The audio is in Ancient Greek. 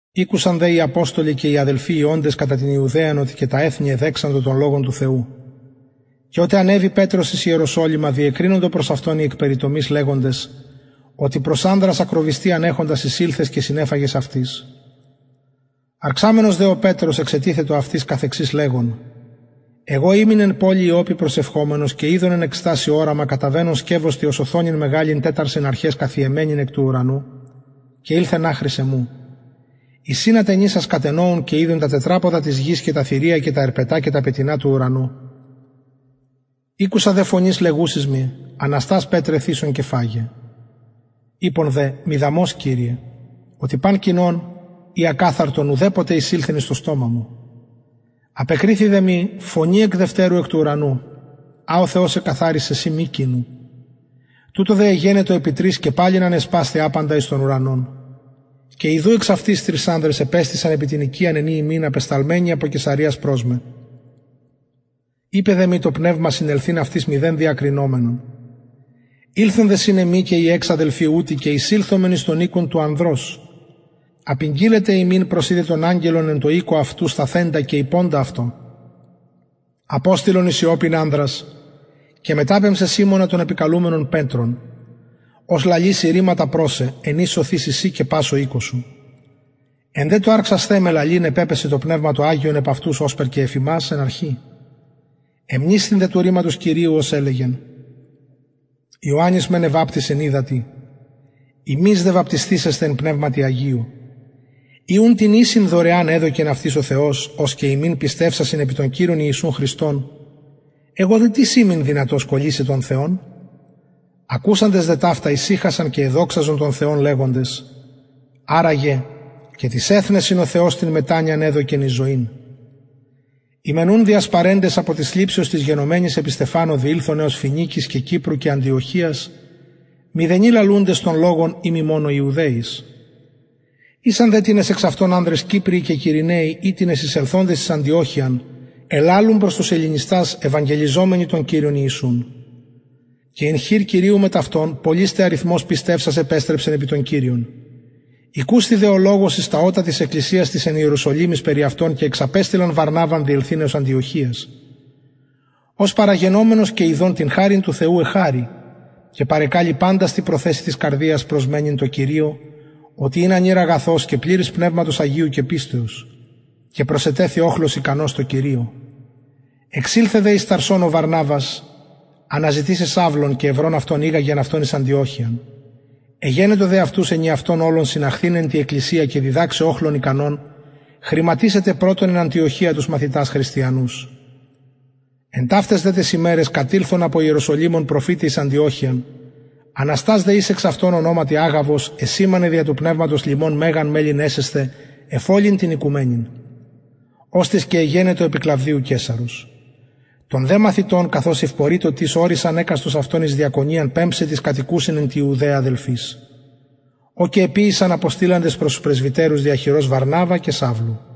ηκουσαν δε οι αποστολοι και οι αδελφοι οι οντες κατα την ιουδαιαν οτι και τα εθνη εδεξαντο τον λογον του θεου και οτε ανεβη πετρος εις ιεροσολυμα διεκρινοντο προς αυτον οι εκ περιτομης λεγοντες οτι προς ανδρας ακροβυστιαν εχοντας εισηλθες και συνεφαγες αυτοις αρξαμενος δε ο πετρος εξετιθετο αυτοις καθεξης λεγων εγω ημην εν πολει ιοππη προσευχομενος και ειδον εν εκστασει οραμα καταβαινον σκευος τι ως οθονην μεγαλην τεσσαρσιν αρχαις καθιεμενην εκ του ουρανου και ηλθεν αχρι εμου εις ην ατενισας κατενοουν και ειδον τα τετραποδα της γης και τα θηρια και τα ερπετα και τα πετεινα του ουρανου ηκουσα δε φωνης λεγουσης μοι αναστας πετρε θυσον και φαγε ειπον δε μηδαμως κυριε οτι παν κοινον η ακαθαρτον ουδεποτε εισηλθεν εις το στομα μου απεκριθη δε μοι φωνη εκ δευτερου εκ του ουρανου α ο θεος εκαθαρισεν συ μη κοινου τουτο δε εγενετο επι τρις και παλιν ανεσπασθη απαντα εις τον ουρανον και ιδου εξαυτης τρεις ανδρες επεστησαν επι την οικιαν εν η ημην απεσταλμενοι απο καισαρειας προς με ειπεν δε μοι το πνευμα συνελθειν αυτοις μηδεν διακρινομενον ηλθον δε συν εμοι και οι εξ αδελφοι ουτοι και εισηλθομεν εις τον οικον του ανδρος απηγγειλεν τε ημιν πως ειδεν τον αγγελον εν τω οικω αυτου σταθεντα και ειποντα αυτω αποστειλον εις ιοππην ανδρας και μεταπεμψαι σιμωνα τον επικαλουμενον πετρον ος λαλησει ρηματα προς σε εν οις σωθηση συ και πας ο οικος σου εν δε τω αρξασθαι με λαλειν επεπεσεν το πνευμα το αγιον επ αυτους ωσπερ και εφ ημας εν αρχη εμνησθην δε του ρηματος κυριου ως ελεγεν ιωαννης μεν εβαπτισεν υδατι υμεις δε βαπτισθησεσθε εν πνευματι αγιω ει ουν την ισην δωρεαν εδωκεν αυτοις ο θεος ως και ημιν πιστευσασιν επι τον κυριον ιησουν χριστον εγω δε τις ημην δυνατος κωλυσαι τον θεον ακουσαντες δε ταυτα ησυχασαν και εδοξαζον τον θεον λεγοντες αρα γε και τοις εθνεσιν ο θεος την μετανοιαν εδωκεν εις ζωην οι μεν ουν διασπαρεντες απο της θλιψεως της γενομενης επι στεφανω διηλθον εως φοινικης και κυπρου και αντιοχειας μηδενι λαλουντες τον λογον ει μη μονον ιουδαιοις ησαν δε τινες εξ αυτων ανδρες κυπριοι και κυρηναιοι οιτινες εισελθοντες εις αντιοχειαν ελαλουν προς τους ελληνιστας ευαγγελιζομενοι τον κυριον ιησουν και ην χειρ κυριου μετ αυτων πολυς τε αριθμος πιστευσας επεστρεψεν επι τον κυριον ηκουσθη δε ο λογος εις τα ωτα της εκκλησιας της εν ιεροσολυμοις περι αυτων και εξαπεστειλαν βαρναβαν διελθειν εως αντιοχειας ος παραγενομενος και ιδων την χαριν του θεου εχαρη και παρεκαλει παντας τη προθεσει της καρδιας προσμενειν τω κυριω οτι ην ανηρ αγαθος και πληρης πνευματος αγιου και πιστεως και προσετεθη οχλος ικανος τω κυριω εξηλθεν δε εις ταρσον ο βαρναβας αναζητησαι σαυλον και ευρων ηγαγεν αυτον εις αντιοχειαν εγενετο δε αυτους ενιαυτον ολον συναχθηναι τη εκκλησια και διδαξαι οχλον ικανον χρηματισαι τε πρωτον εν αντιοχεια τους μαθητας χριστιανους εν ταυταις δε ταις ημεραις κατηλθον απο ιεροσολυμων προφηται εις αντιοχειαν αναστας δε εις εξ αυτων ονοματι αγαβος εσημανεν δια του πνευματος λιμον μεγαν μελλειν εσεσθαι εφ ολην την οικουμενην οστις και εγενετο επι κλαυδιου καισαρος των δε μαθητων καθως ευπορειτο τις ωρισαν εκαστος αυτων εις διακονιαν πεμψαι τοις κατοικουσιν εν τη ιουδαια αδελφοις ο και εποιησαν αποστειλαντες προς τους πρεσβυτερους δια χειρος βαρναβα και σαυλου